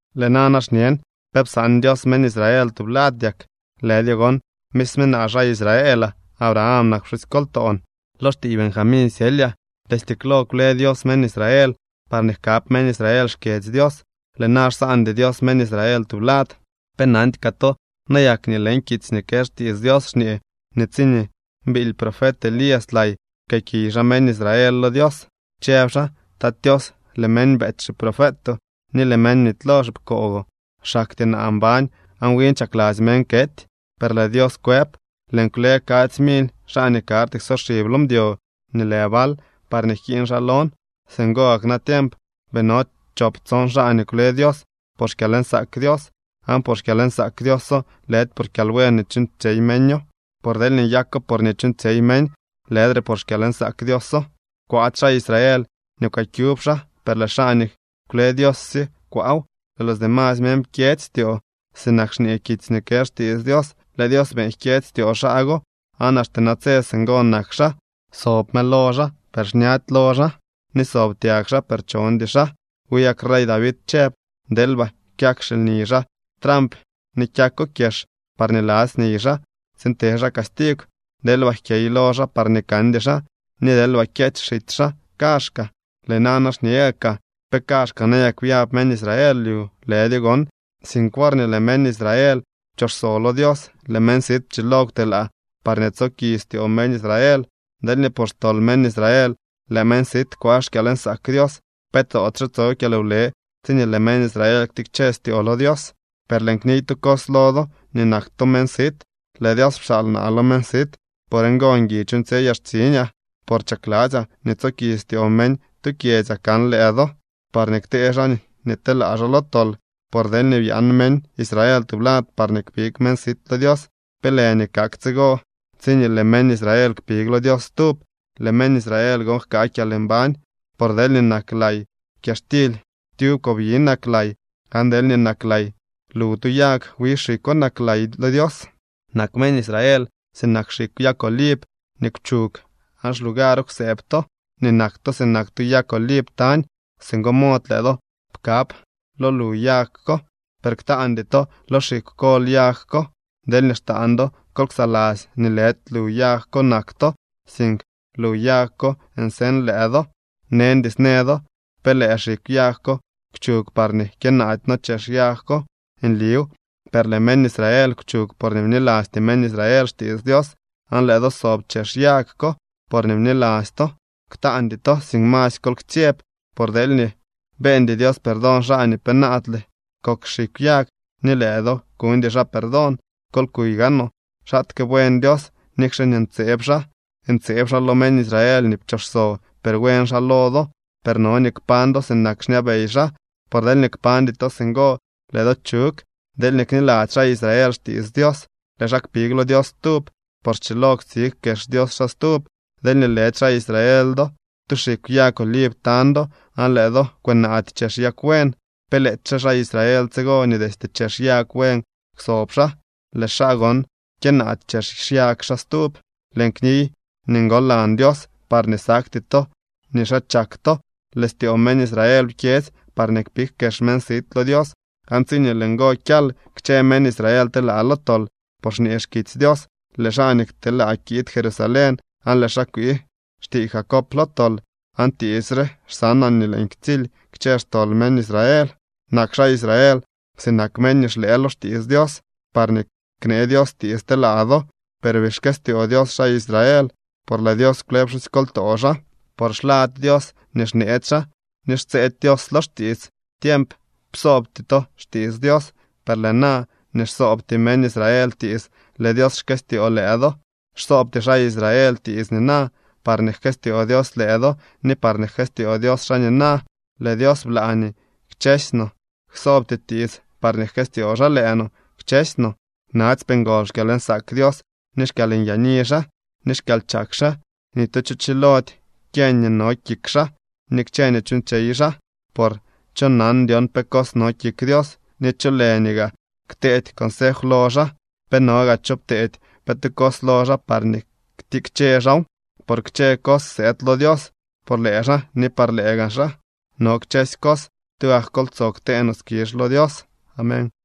Lëë nana xñen: ¿Pe psaan Dios meñ Israel tublad yak? ¡Lëdyo gon! Misme naa, xaa Israelaa. Abraham nak pxusykoltoon. Lo xtiiy Benjamín syelyaa. Destye klo kwle Dios meñ Israel parñee jkab meñ Israel xkyedzy Dios. Lëë na xsaandy Dios meñ Israel tublad. ¿Pe nandy kaa to nayak nii leñ kitsy nii kë xtiits Dios xñee nii tsiñee biily profet Elías lay, pkëëkiy xaa meñ Israel lo Dios? Chëb xaa: “Tat Tios, lëë meñ beety xiprofetoo ni lëë meñ bnitylo xipkoogoo. Xaktyee naa mbañ aan win chakladzy meñ kety.” Per lëë Dios kwëb: “Lëën kwle kadzy mily xaa nii karty ksoxib lo mdyo nii lë Baal parñee jkiiñ xaa lon.” Singo gak natiemp bii no chop tson xaa nii kwle Dios por xkyalnsaak Dios. Aan por xkyalnsaak Dioso, lëdy por kyalbuen nii chuuñtsyey meño. Por deelñee nyako por nii chuuñtsyey meñ, lëdre por xkyalnsaak Dioso. Kwaady xaa Israel nii kwëkyub xaa, per lëë xaa nii kwle Dios sye kwaaw. Lëë los demasy meñ pkyedzy styoo, sinak xñee kitsy nii kë xtiits Dios: “Lëë Dios beeñ jkyedzy styoo xaa go, aan axte natse singo nak xaa. Sob mëlo xaa, per xñady lo xaa, ni sob tyag xaa, per chondy xaa.” Wi gak rey David chëb: Deelba kyak xilni xaa tramp ni kyako kyex, parñee ladzy niy xaa tsiin te xaa castigw. Deelba jkyey lo xaa parñee kandy xaa, ni deelba kyeech xitsy xaa kaazhkaa. Lëë nana xñe gaakaa: ¿Pe kaazhkaa nayak byab meñ Israel lyu? ¡Lëdyo gon!, sink worñee nii lëë meñ Israel pchooxso lo Dios, lëë meñ sit pchilo kwtelaa parñee tsoki styoo meñ Israel. Deelñee por xtol meñ Israel lëë meñ sit kwaa xkyalnsaak Dios, ¿pe toodyxe tso kyalwle tsiñee lëë meñ Israel ktikche styoo lo Dios? Per lëën kniy tu cos lo do nii nak to meñ sit. Lëë Dios pxaal naa lo meñ sit. Por ngo ngui chuuñtsyeyaa xtsiñaa. Por chakladzyaa nii tsoki styoo meñ tu kyedzyaa kan lëë do parñee ktee xaa nii telaa xaa lo tol. Por deelñee byaan meñ Israel tublad parñee kpig meñ sit lo Dios, ¿pe lë nii kak tsigo tsiñee lëë meñ Israel kpig lo Dios stub? Lëë meñ Israel gon jkaa kyalmbañ. Por deelñee nak lay kyaxtily, tyub kobyi nak lay, aan deelñee nak lay lu tu yag, wi xikwo nak lay lo Dios. Nak meñ Israel sinak xikw yag oliv nii kwchug, aan xlugaro kwsëëb to nii nak to sinak tu yag oliv tañ. Singo mod lëë do pkab lo lu yag ko. Per ktaandy to lo xikw kol yag ko. Deelñee xtaan do, kol ksaladzy nii lëdy lu yag ko nak to, sink lu yag ko nseñ lëë do. Neñdy snë do: “Per lëë xikw yag ko kwchug parñee kyënaady no chex yag ko.” Nliw, per lëë meñ Israel kwchug porñee bnilasty meñ Israel xtiits Dios, aan lëë do sob chex yag ko porñee bniladzy to. Ktaandy to, sink masy kol ktsyeb. Por deelñee beeñdy Dios perdón xaa nii penaadle kok xikw yag, ni lëë do kuñdy xaa perdón. Kol kuy gaanoo xaatke buen Dios, nikxe nii ntseeb xaa. Ntseeb xaa lo meñ Israel nii pchooxso, per buen xaa lo do. Per no nii kpañ do sinak xñabey xaa, por deelñee kpañdy to singo, lëë do chug. Deelñee kniladzy xaa Israel xtiits Dios, lëë xaa kpig lo Dios stub, por schilo ktsig kex Dios xaa stub. Deelñee lëdy xaa Israel do, tu xikw yag oliv tañ do, aan lëë do kwënaady chex yag buen. ¿Pe lëëdyxe xaa Israel tsigo nii destye chex yag buen kwsob xaa, lëë xaa gon kyënaady chex xyag xaa stub? Lëën kniy nii ngolan Dios, parñee sakty to nii xaa chak to. Lëë styoo meñ Israel pkyedzy parñee kpig kex meñ sit lo Dios. Aan tsiñee lëë ngo kyal, kchë meñ Israel telaa lo tol, por xñee xkitsy Dios: Lëë xaa nii kteelaa kiid Jerusalén, aan lëë xaa kwii xtiiy Jacob lo tol. Aan tiits re xsanaa, nii lëën ktsily kchë xtol meñ Israel. Nak xaa Israel sinak meñ nii xlëë lo xtiits Dios, parñee knee Dios tiits telaa do. Per bii xkëstyoo Dios xaa Israel, por lëë Dios kwle pxusykoltoo xaa. Por xlady Dios nii xneetsy xaa, ni xtsëëdy Dios lo xtiits. Tiemp psoobty to xtiits Dios, per lëë na nii xsoobty meñ Israel tiits, lëë Dios xkëstyoo lëë do. Xsoobty xaa Israel tiits nina, parñee jkëstyoo Dios lëë do ni parñee jkëstyoo Dios xaa nina. Lëë Dios blaa nii kchësy no ksoobty tiits, parñee jkëstyoo xaa lëë no, kchësy no. ¡Natsypee ngol xkyalnsaak Dios, ni xkyalnyaani xaa, ni xkyalchak xaa! Ni tu cho chilody kyeñ nii no kik xaa ni kchë nii chuuñtsyey xaa. Por ¿cho nan na dyon pe cos no kik Dios? ¿Ni cholë nii gaa kteedy consef lo xaa? ¿Pe no gaa cho pteedy pe tu cos lo xaa parñee ktikche xaaw? Por kchë cos sëëd lo Dios. Por lëë xaa ni par lëë gaa xaa no kchësy cos. ¡Tugak kol tsoo ktee no skizh lo Dios! Amén.